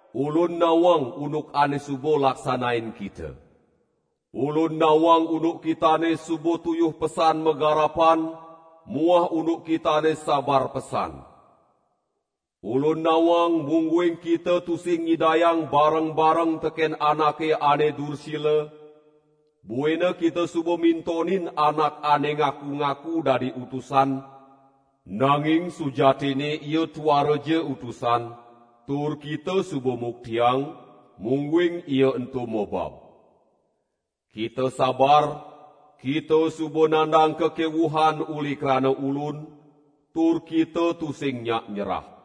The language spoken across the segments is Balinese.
Ulun nawang unduk ane suba laksanain kita. Ulun nawang unduk kitane suba tuyuh pesan magarapan muah unduk kitane sabar pesan. Ulun nawang mungguing kita tusing nyidayang bareng-bareng teken anake ane dursila, buina kita suba mintonin anak ane ngaku-ngaku dadi utusan, nanging sujatinne ia tuaraja utusan, tur kita suba muktiang, mungguing ia ento mobab. Kita sabar, kita suba nandang kakewuhan uli krana Ulun, tur kita tusing nyak nyerah.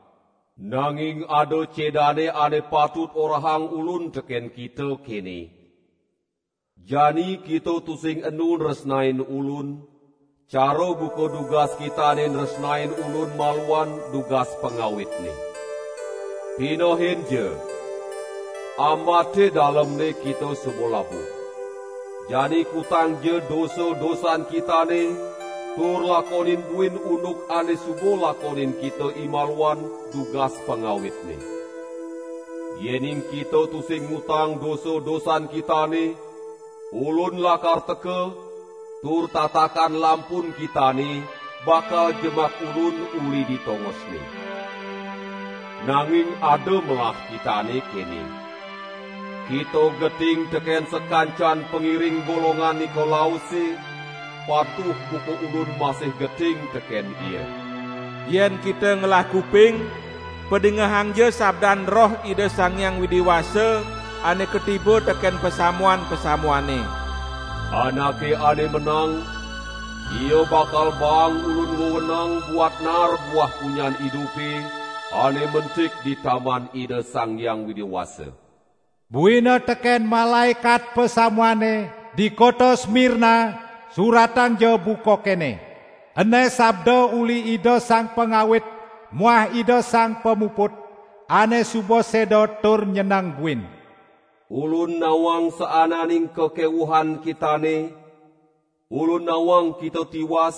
Nanging ada cedane ane patut orahang Ulun teken kita kene: Jani kita tusing enu nresnain Ulun, cara buka dugas kitane nresnain Ulun maluan dugas pangawitne. Pinehinja, ambate dalemne kita suba labuh! Jani kutangja dosa-dosan kitane tur lakonin buin unduk ane suba lakonin kita imaluan dugas pangawitne. Yening kita tusing ngutang dosa-dosan kitane, Ulun lakar teka, tur tatakan lampun kitane bakal jemak Ulun uli di tongosne. Nanging ada melah kitane kene: Kita geting teken sakancan pangiring golongan Nikolause, patuh buka Ulun masih geting teken ia. Yen kita ngelah kuping, padingehangja sabdan Roh Ida Sang Hyang Widi Wasa ane katiba teken pasamuan-pasamuane. Anake ane menang, ia bakal baang Ulun wewenang buat naar buah punyan idupe ane mentik di Taman Ida Sang Hyang Widi Wasa." "Buina teken malaekat pasamuane di kota Smirna suratangja buka kene: Ene sabda uli Ida Sang Pangawit muah Ida Sang Pamuput, ane suba seda tur nyeneng buin. Ulun nawang saananing kakewuhan kitane, Ulun nawang kita tiwas,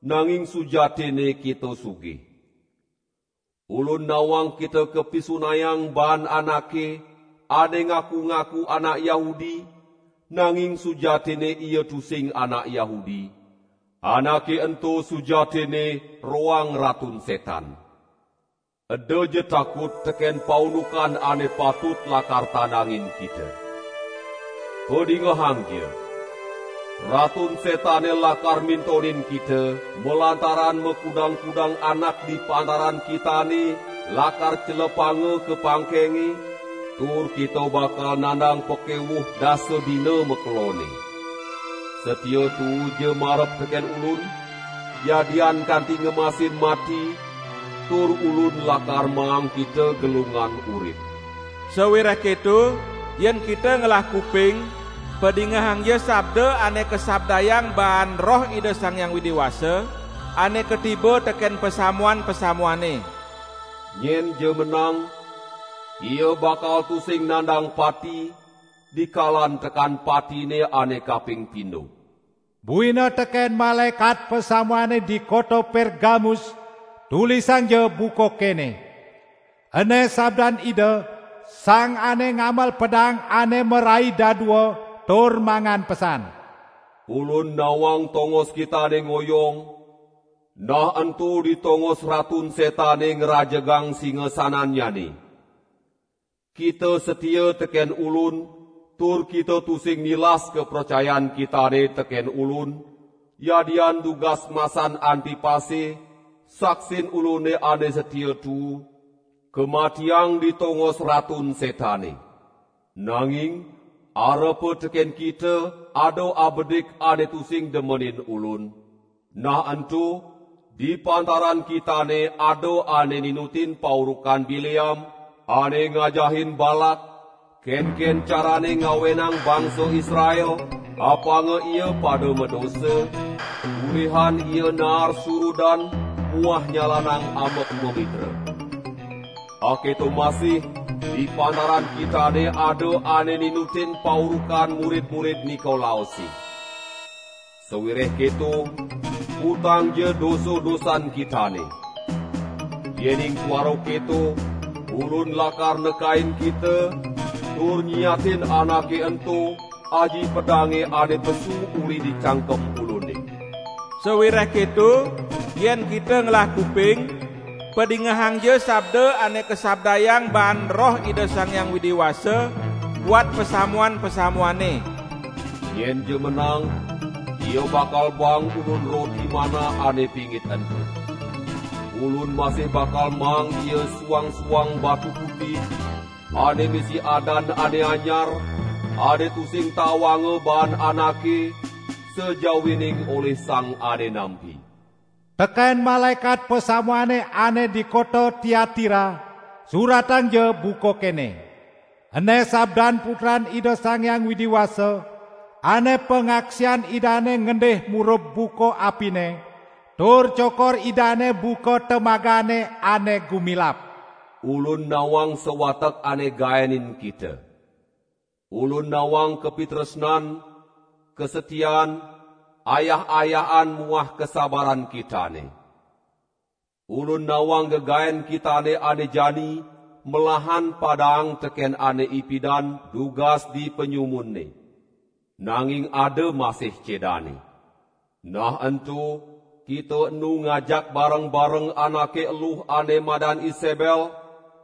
nanging sujatinne kita sugih. Ulun nawang kita kapisunayang baan anake, ane ngaku-ngaku anak Yahudi, nanging sujatinne ia tusing anak Yahudi; anake ento sujatinne roang Ratun Setan. Edaja takut teken paundukan ane patut lakar tandangin kita. Padingehangja! Ratun Setane lakar mintonin kita, malantaran makudang-kudang anak di pantaran kitane lakar celepanga ka pangkenge, tur kita bakal nandang pakewuh dasa dina makelonne. Satia tuuja marep teken Ulun, yadian kanti ngemasin mati, tur Ulun lakar maang kita gelungan urip. Sawireh keto, yen kita ngelah kuping, padingehangja sabda ane kasabdayang baan Roh Ida Sang Hyang Widi Wasa ane katiba teken pasamuan-pasamuane. Nyenja menang, ia bakal tusing nandang pati, dikalan tekan patine ane kaping pindo." "Buina teken malaekat pasamuane di kota Pergamus, tulisangja buka kene: Ene sabdan Ida, Sang ane ngamel pedang ane merai dadua tur mangan pesan. Ulun nawang tongos kitane ngoyong, nah ento di tongos Ratun Setane ngrajegang singasanannyane. Kita satia teken Ulun tur kita tusing nilas kapracayan kitane teken Ulun, yadian dugas masan Antipase, saksin Ulune ane satia tuu, kamatiang di tongos Ratun Setane. Nanging arepa teken kita ada abedik ane tusing demenin Ulun; nah ento di pantaran kitane ada ane ninutin paurukan Bileam, ane ngajahin Balak, kenken carane ngawenang bangsa Israel apanga ia pada madosa, ulihan ia naar surudan muah nyalanang ambek mamitra. Aketo masih di pantaran kitane ada ane ninutin paurukan murid-murid Nikolause. Sawireh keto, kutangja dosa-dosan kitane! Yening tuara keto Ulun lakar nekain kita tur nyiatin anake ento aji pedange ane pesu uli di cangkem Ulune. Sawireh keto, yen kita ngelah kuping, padingehangja sabda ane kasabdayang baan Roh Ida Sang Hyang Widi Wasa buat pasamuan-pasamuane! Nyenja menang, ia bakal baang Ulun roti manna ane pingit ento. Ulun masih bakal maang ia suang-suang batu putih, ane misi adan ane anyar, ane tusing tawanga baan anake, sajawining olih sang ane nampi." Teken malaekat pasamuane ane di kota Tiatira, suratangja buka kene: "Ene sabdan Putran Ida Sang Hyang Widi Wasa, ane pangaksian Idane ngendih murub buka apine, tur cokor Idane buka temagane ane gumilap. Ulun nawang sawatek ane gaenin kita. Ulun nawang kapitresnan, kasatian, ayah-ayahan muah kasabaran kitane. Ulun nawang gegaen kitane ane jani melahan padaang teken ane ipidan dugas di panyumunne. Nanging ada masih cedane. Nah ento kita enu ngajak bareng-bareng anake eluh ane madan Isebel,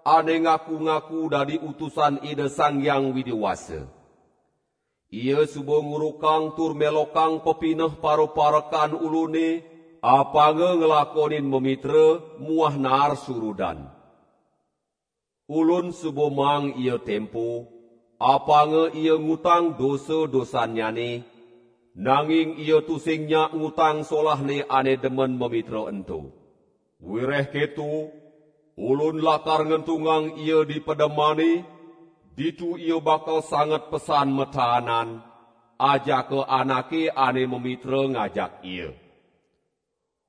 ane ngaku-ngaku dadi utusan Ida Sang Hyang Widi Wasa. Ia suba ngurukang tur melokang pepineh paraparekan Ulune apanga nglakonin mamitra muah naar surudan. Ulun suba maang ia tempo, apanga ia ngutang dosa-dosannyane, nanging ia tusing nyak ngutang solahne ane demen mamitra ento. Wireh keto Ulun lakar ngentungang ia di pedemane, ditu ia bakal sanget pesan mataanan, ajaka anake ane mamitra ngajak ia.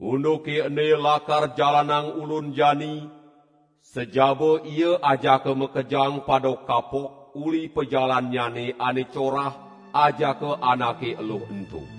Unduke ene lakar jalanang Ulun jani, sajaba ia ajaka makejang pada kapok uli pajalannyane ane corah ajaka anake eluh ento.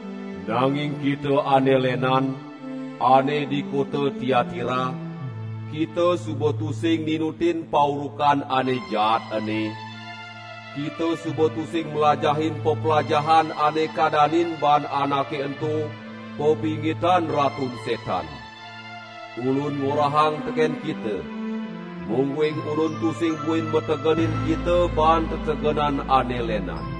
Nanging kita ane lenan, ane di kota Tiatira, kita suba tusing ninutin paurukan ane jaat ene; kita suba tusing mlajahin peplajahan ane kadanin baan anake ento: "Papingitan Ratun Setan". Ulun ngorahang teken kita, mungguing Ulun tusing buin mategenin kita baan tetegenan ane lenan.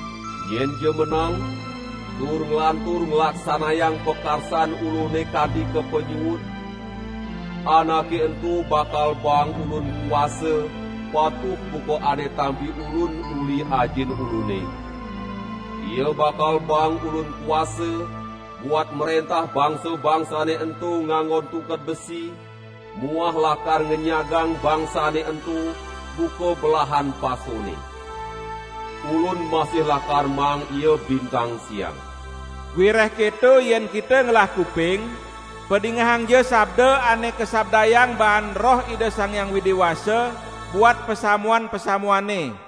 Nyenja menang, tur nglantur nglaksanayang pakarsan Ulune kanti ka panyuud, anake ento bakal baang Ulun kuasa patuh buka ane tampi Ulun uli Ajin Ulune; ia bakal baang Ulun kuasa buat mrentah bangsa-bangsane ento nganggon tungked besi muah lakar ngenyagang bangsane ento buka belahan pasone. Ulun masih lakar maang ia bintang siang. Wireh keto yen kita ngelah kuping, padingehangja sabda ane kasabdayang baan Roh Ida Sang Hyang Widi Wasa buat pasamuan-pasamuane!"